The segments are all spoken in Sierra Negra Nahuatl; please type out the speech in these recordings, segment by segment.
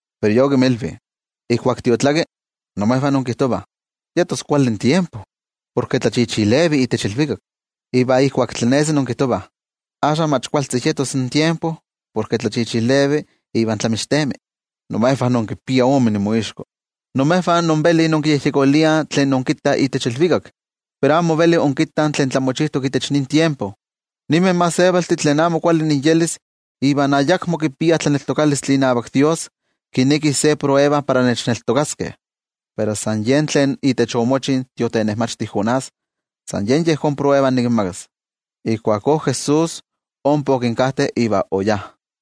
Pero Ye okinmilvi: —In tiotlakkampa, imejvah inkijtovah: “Yetos kuali tiempo, porke tlachichilevi itech ilvikak.” Iva kualkampa inkijtovah: “Axka mach kualtzi yetos in tiempo porke tlachichilevi iva tlamixtemi.” ¡Imejvah inkipiah ome inmoixko! Imejvah invelih inkiyejyekoliah tlen inkittah itech ilvikak, pero amo invelih inkittah tlen tlamochijtok itech nin tiempo. Ninmeh gentejtih tlen amo kuali inyelis iva ayakmo kipiah tlaneltokalistli inavak Dios, kinekih ma nikinmititi se tetzavkaneskayotl para nechneltokaskeh. Pero san yen tlen itech omochi in tiotenejmachti Jonás, san yen yejón tetzavkaneskayotl nikinmakas. Ijkuakó Jesús ompa okinkajte iva oyá.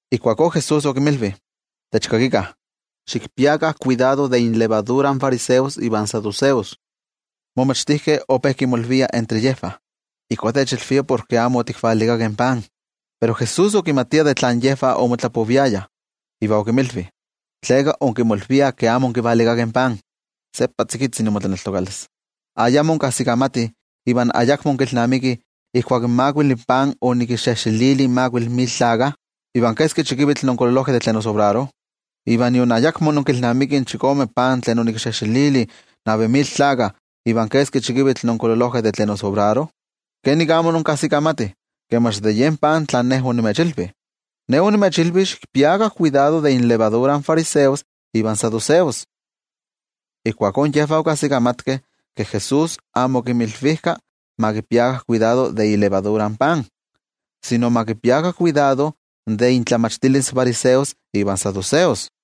Ijkuakó Jesús okinmilvi: —Techkakikah. Xikpiakah kuidado de inxokotix in fariseos ivan saduceos. In momachtijkeh ope kimolviah entre yejvah: —Ijkó techilvia porke amo otikvalikakeh pan. Pero Jesús okimatia de tlan yejvah omotlapoviayah, iva okinmilvi: —¿Tleka inkimolviah ke amo onkivalikakeh pan? ¡Seppa tzikitzi imotlaneltokalis! ¿Ayamo inkajsikamatih iva ayakmo inkilnamikih ijkuak in makuili pan onikinxejxelili in makuili mil tlakah, iva keski chikivitl onkololojkeh de tlen osobraro? ¿Iva nion ayakmo inkilnamikih in chikome pan tlen onikinxejxelili in navi mil tlakah, iva keski chikivitl onkololojkeh de tlen osobraro? ¿Kenik amo inkajsikamatih ke mach de yen pan tlan Ne onimechilvi? Ne onimechilvi xikpiakah kuidado de inxokotix in fariseos ivan saduceos. Ijkuakó yejvah okajsikamatkeh ke Jesús amo okinmilvijka ma kipiakah kuidado de yen xokotixtli tlen kitlaliliah in pan, sino ma kipiakah kuidado de intlamachtilis in fariseos ivan saduceos.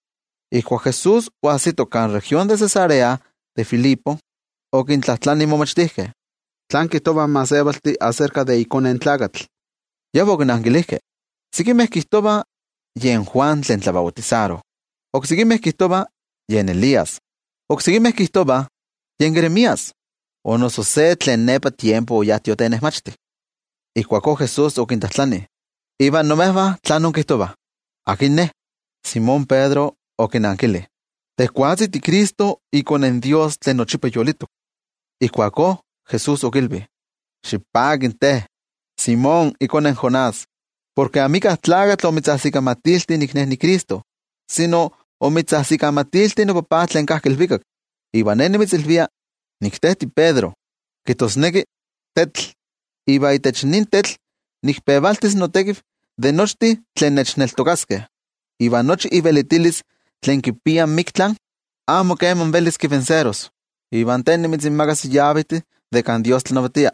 Ijkuak Jesús oajsito kan región de Cesarea de Filipo, okintlajtlani in momachtijkeh: —¿Tlán kijtovah in gentejtih aserka de iKone in Tlakatl? Yejvah okinankilijkeh: —Sekimeh kijtovah yen Juan tlen tlabautisaro, oksekimeh kijtovah yen Elías, iva oksekimeh kijtovah yen Jeremías o noso se tlen nepa tiempo oyá tiotenejmachti. Ijkuakó Jesús okintlajtlani: —Iva imejvah, ¿tlán inkijtovah? ¿Akin Ne? Simón Pedro okinankili: —Tejwatzi tiCristo, iKone in Dios tlen yolitok. Ijkuakó Jesús okilvi: —Xipaki te, Simón, ikone in Jonás, porke amika tlakatl omitzajsikamatilti nik Ne niCristo, sino omitzajsikamatilti noTajtzi tlen kajki ilvikak. Iva Ne nimitzilvia, nik te tiPedro (kijtosneki tetl), iva itech nin tetl nikpevaltis notekiv de nochtin tlen nechneltokaskeh. Iva nochi ivelitilis tlen kipia in miktla, amo keman velis kintlanilis. Iva te nimitzinmakas in yavejtih de kan Dios tlanavatia.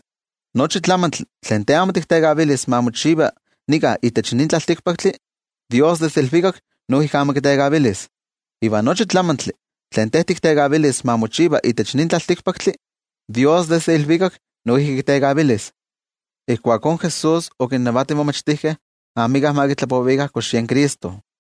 Nochi tlamantli tlen te amo tiktekavilis ma mochiva nika itech nin tlaltikpaktli, Dios desde ilvikak noijki amo kitekavilis. Iva nochi tlamantli tlen te tiktekavilis ma mochiva itech nin tlaltikpaktli, Dios desde ilvikak noijki kitekavilis. Ijkuakó Jesús okinnavati in momachtijkeh amika ma kitlapovikah kox yen Cristo.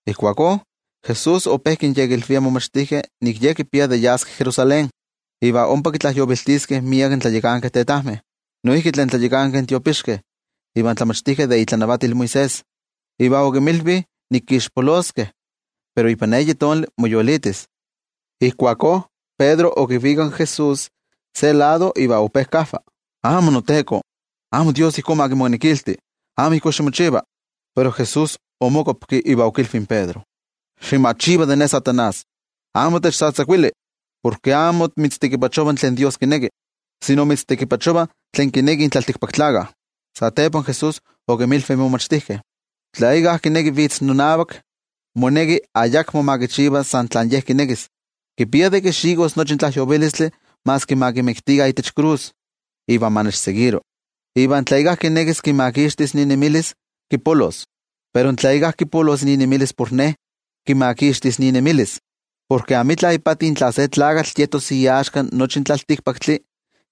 Ijkuakó Jesús ope kinyekilvia in momachtijkeh nik Ye kipia de yas Jerusalén iva ompa kitlajyoviltiskeh miek in tlayakankeh tetajmeh, noijki tlen tlayakankeh tiopixkeh iva in tlamachtijkeh de itlanavatil Moisés. Iva okinmilvi nik kixpoloskeh, pero ipan eyi tonali moyolitis. Ijkuakó Pedro okivikak in Jesús se lado, iva ope kajva: —¡Amó, noTeko, amo Dios ma kimonekilti! ¡Amo ijkó ximochiva! Pero Jesús omokuapki iva okilvi in Pedro: —¡Ximachiva de Ne, Amo Kuali Tlakatl! ¡Amo techtzatzakuili! Porke amo mitztekipachova tlen Dios kineki, sino mitztekipachova tlen kinekih in tlaltikpaktlakah. Satepa Jesús okinmilvi in momachtijkeh: —Tla íkka kineki vitz nonavak, moneki ayakmo ma kichiva san tlen ye kinekis. Kipia de kixikos nochi in tlajyovilistli maski ma kimiktikah itech krus, iva ma nechseguiro. Iva tla íkka kinekis kimakixtis inemilis, kipolos. Pero tla íkka kipolos inemilis por Ne, kimakixtis inemilis. Porke amitla ipati tla se tlakatl yetos iaxka nochi in tlaltikpaktli,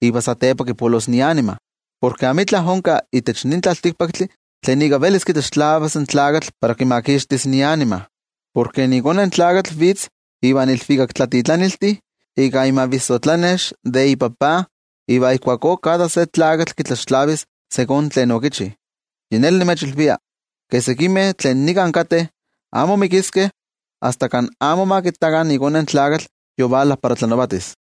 iva satepa kipolos ianima. Porke amitla onka itech nin tlaltikpaktli tlen ika velis kitlaxtlavas in tlakatl para kimakixtis ianima. Porke iKone in Tlakatl vitz ivan ilvikaktlatitlaniltih ika imavissotlanex de iTajtzi iva ijkuakó kada se tlakatl kitlaxtlavis ijkó kemi tlen okichi. Yi neli nimechilvia, ke sekimeh tlen nika kateh, amo mikiskeh asta kan amo ma kittakah iKone in Tlakatl yovala para tlanavatis.